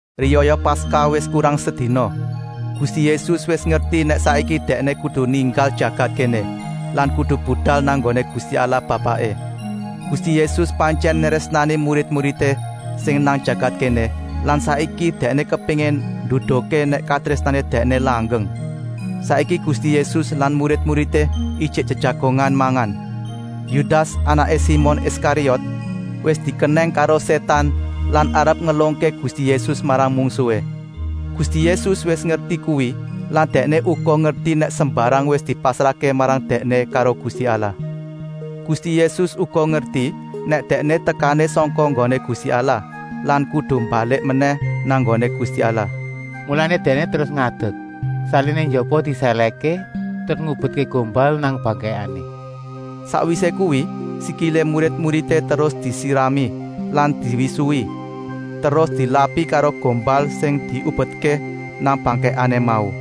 Riyaya Paskah wis kurang sedina. Gusti Yésus wis ngerti nèk saiki Dèkné kudu ninggal jagat kéné lan kudu budal nang nggoné Gusti Allah Bapaké. Gusti Yésus pantyèn nrésnani murid-muridé sing nang jagat kéné lan saiki Dèkné kepéngin nduduhké nèk katrésnané Dèkné langgeng. Saiki Gusti Yésus lan murid-muridé ijik jejagongan mangan. Yudas, anaké Simon Iskariot, wis dikenèng karo Sétan lan arep ngelungké Gusti Yésus marang mungsuhé. Gusti Yésus wis ngerti kuwi lan Dèkné uga ngerti nèk sembarang wis dipasrahké marang Dèkné karo Gusti Allah. Gusti Yésus uga ngerti nèk Dèkné tekané sangka nggoné Gusti Allah lan kudu balik menèh nang nggoné Gusti Allah. Mulané Dèkné terus ngadek, saliné njaba disèlèhké, terus ngubetké gombal nang bangkèkané. Sakwisé kuwi sikilé murid-muridé terus disirami lan diwisuhi terus dilapi karo gombal sing diubetké nang bangkèkané mau.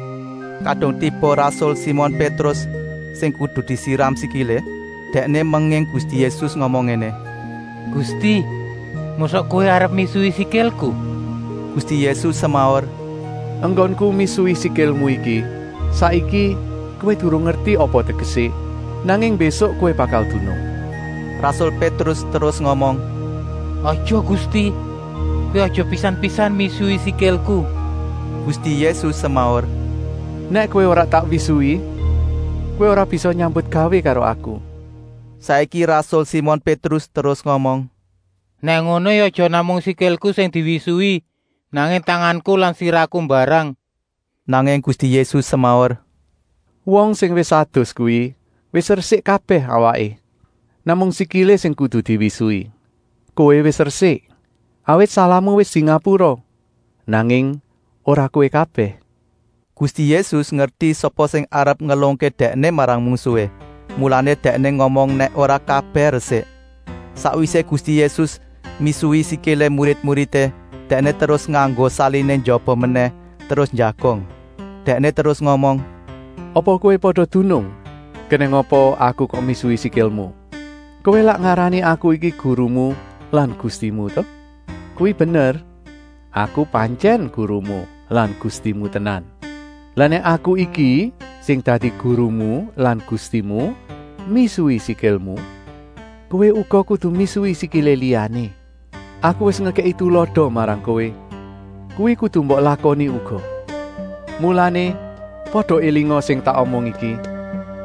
Kadung tiba rasul Simon Pétrus sing kudu disiram sikilé, dèkné menging Gusti Yésus ngomong ngéné: “Gusti, mosok Kowé arep misuhi sikilku?” Gusti Yésus semaur: “Enggonku misuhi sikilmu iki saiki kowé durung ngerti apa tegesé, nanging mbésuk kowé bakal dunung.” Rasul Pétrus terus ngomong: “Aja Gusti, Kowé aja pisan-pisan misuhi sikilku!” Gusti Yésus semaur: “Nèk kowé ora tak wisuhi, kowé ora bisa nyambutgawé karo Aku.” Saiki rasul Simon Pétrus terus ngomong: “Nèk ngono ya aja namung sikilku sing diwisuhi, nanging tanganku lan sirahku mbarang!” Nanging Gusti Yésus semaur: “Wong sing wis adus kuwi wis resik kabèh awaké. Namung sikilé sing kudu diwisuhi. Kowé wis resik, awit salahmu wis dingapura, nanging ora kowé kabèh.” Gusti Yésus ngerti sapa sing arep ngelungké Dèkné marang mungsuhé, mulané Dèkné ngomong nèk ora kabèh resik. Sakwisé Gusti Yésus misuhi sikilé murid-muridé, Dèkné terus nganggo saliné njaba menèh terus njagong. Dèkné terus ngomong: “Apa kowé pada dunung kenèng apa kok Aku misuhi sikilmu? Kowé lak ngarani Aku iki Gurumu lan Gustimu ta? Kuwi bener, Aku pantyèn Gurumu lan Gustimu tenan. Lah nèk Aku iki, sing dadi Gurumu lan Gustimu, misuhi sikilmu, kowé uga kudu misuhi sikilé liyané. Aku wis ngekèki tulada marang kowé, kuwi kudu mbok lakoni uga. Mulané pada élinga sing tak omong iki: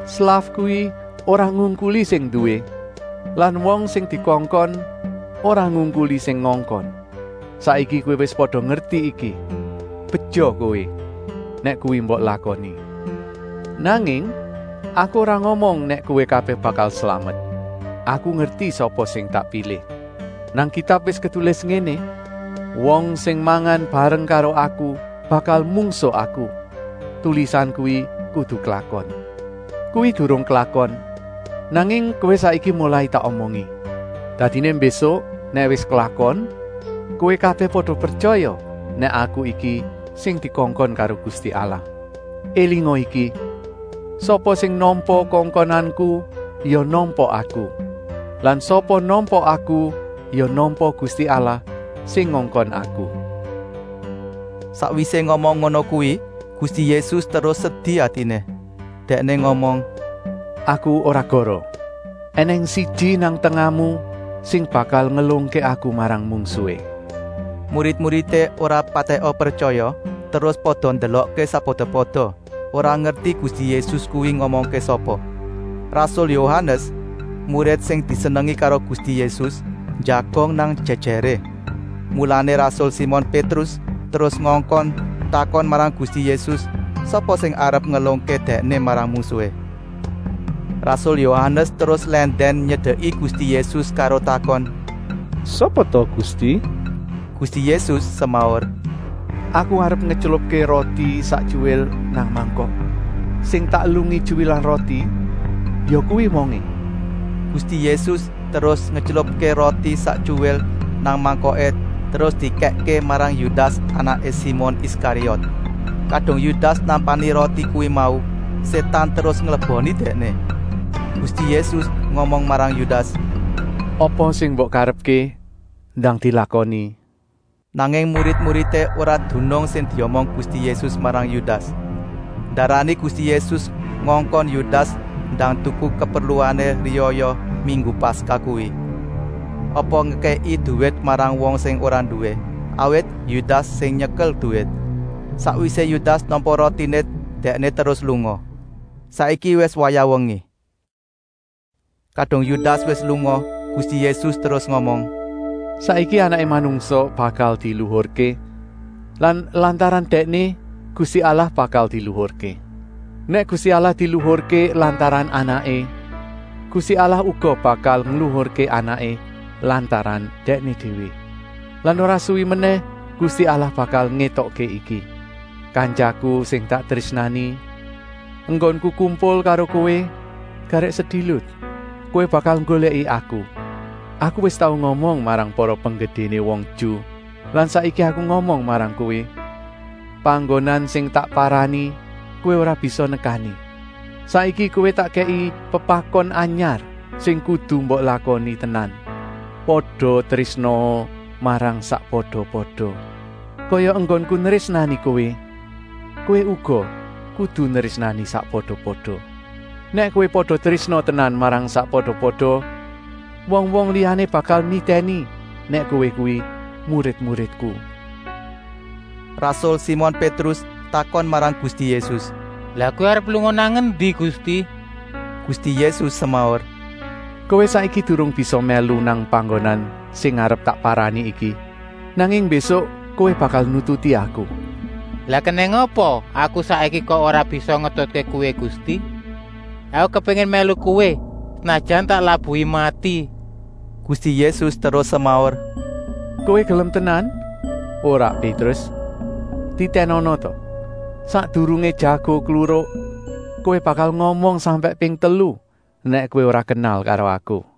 slaf kuwi ora ngungkuli sing nduwé lan wong sing dikongkon ora ngungkuli sing ngongkon. Saiki kowé wis pada ngerti iki, beja kowé, nèk kuwi mbok lakoni.” “Nanging Aku ora ngomong nèk kowé kabèh bakal slamet. Aku ngerti sapa sing tak pilih. Nang Kitab wis ketulis ngéné: ‘Wong sing mangan bareng karo Aku bakal mungsuh Aku.’ Tulisan kuwi kudu klakon. Kuwi durung klakon, nanging kowé saiki molai tak omongi. Dadiné mbésuk nèk wis klakon, kowé kabèh pada pretyaya nèk Aku iki sing dikongkon karo Gusti Allah. Elinga iki: sapa sing nampa kongkonanku ya nampa Aku. Lan sapa nampa Aku ya nampa Gusti Allah sing ngongkon Aku.” Sakwisé ngomong ngono kuwi Gusti Yésus terus sedi atiné. Dèkné ngomong: “Aku ora goroh. Enèng siji nang tengahmu sing bakal ngelungké Aku marang mungsuhé.” Murid-muridé ora patèka pretyaya terus pada ndelokké sakpada-pada, ora ngerti Gusti Yésus kuwi ngomongké sapa. Rasul Yohanes, murid sing disenengi karo Gusti Yésus, njagong nang jèjèré. Mulané rasul Simon Pétrus terus ngongkon takon marang Gusti Yésus, sapa sing arep ngelungké Dèkné marang mungsuhé. Rasul Yohanes terus lèndèn nyedeki Gusti Yésus karo takon: “Sapa ta Gusti?” Gusti Yésus semaur: “Aku arep ngetylupké roti sak tyuwil nang mangkok. Sing tak elungi tyuwilan roti, yakuwi wongé!” Gusti Yésus terus ngetylupké roti sak tyuwil nang mangkoké terus dikèkké marang Yudas, anaké Simon Iskariot. Kadung Yudas nampani roti kuwi mau, Sétan terus ngleboni dèkné. Gusti Yésus ngomong marang Yudas: “Apa sing mbok karepké ndang dilakoni.” Nanging murid-muridé ora dunung sing diomong Gusti Yésus marang Yudas. Ndarani Gusti Yésus ngongkon Yudas ndang tuku kaperluané riyaya minggu Paskah kuwi, apa ngekèki duwit marang wong sing ora nduwé, awit Yudas sing nyekel duwit. Sakwisé Yudas nampa rotiné dèkné terus lunga. Saiki wis wayah wengi. Kadung Yudas wis lunga Gusti Yésus terus ngomong: “Saiki Anaké Manungsa bakal diluhurké lan lantaran Dèkné Gusti Allah bakal diluhurké. Nèk Gusti Allah diluhurké lantaran Anaké, Gusti Allah uga bakal ngluhurké Anaké lantaran Dèkné déwé. Lan ora suwi menèh Gusti Allah bakal ngétokké iki. Kantyaku sing tak trésnani, enggonku kumpul karo kowé garèk sedilut. Kowé bakal nggolèki Aku. Aku wis tau ngomong marang para penggedéné wong Ju lan saiki Aku ngomong marang kowé: panggonan sing tak parani kowé ora bisa nekani. Saiki kowé tak kèki pepakon anyar sing kudu mbok lakoni tenan: pada trésnaa marang sakpada-pada. Kaya enggonku nrésnani kowé, kowé uga kudu nrésnani sakpada-pada. Nèk kowé pada trésna tenan marang sakpada-pada, wong-wong liyané bakal nitèni nèk kowé kuwi murid-muridku.” Rasul Simon Pétrus takon marang Gusti Yésus: “Lah Kowé arep lunga nang endi Gusti?” Gusti Yésus semaur: “Kowé saiki durung bisa mèlu nang panggonan sing arep tak parani iki, nanging mbésuk kowé bakal nututi Aku.” “Lah kenèng apa aku saiki kok ora bisa ngetutké Kowé Gusti? Aku kepéngin mèlu Kowé, senajan tak labuhi mati!” Gusti Yésus terus semaur: “Kowé gelem tenan? Ora Pétrus, titènana ta, sakdurungé jago kluruk kowé bakal ngomong sampèk ping telu nèk kowé ora kenal karo Aku!”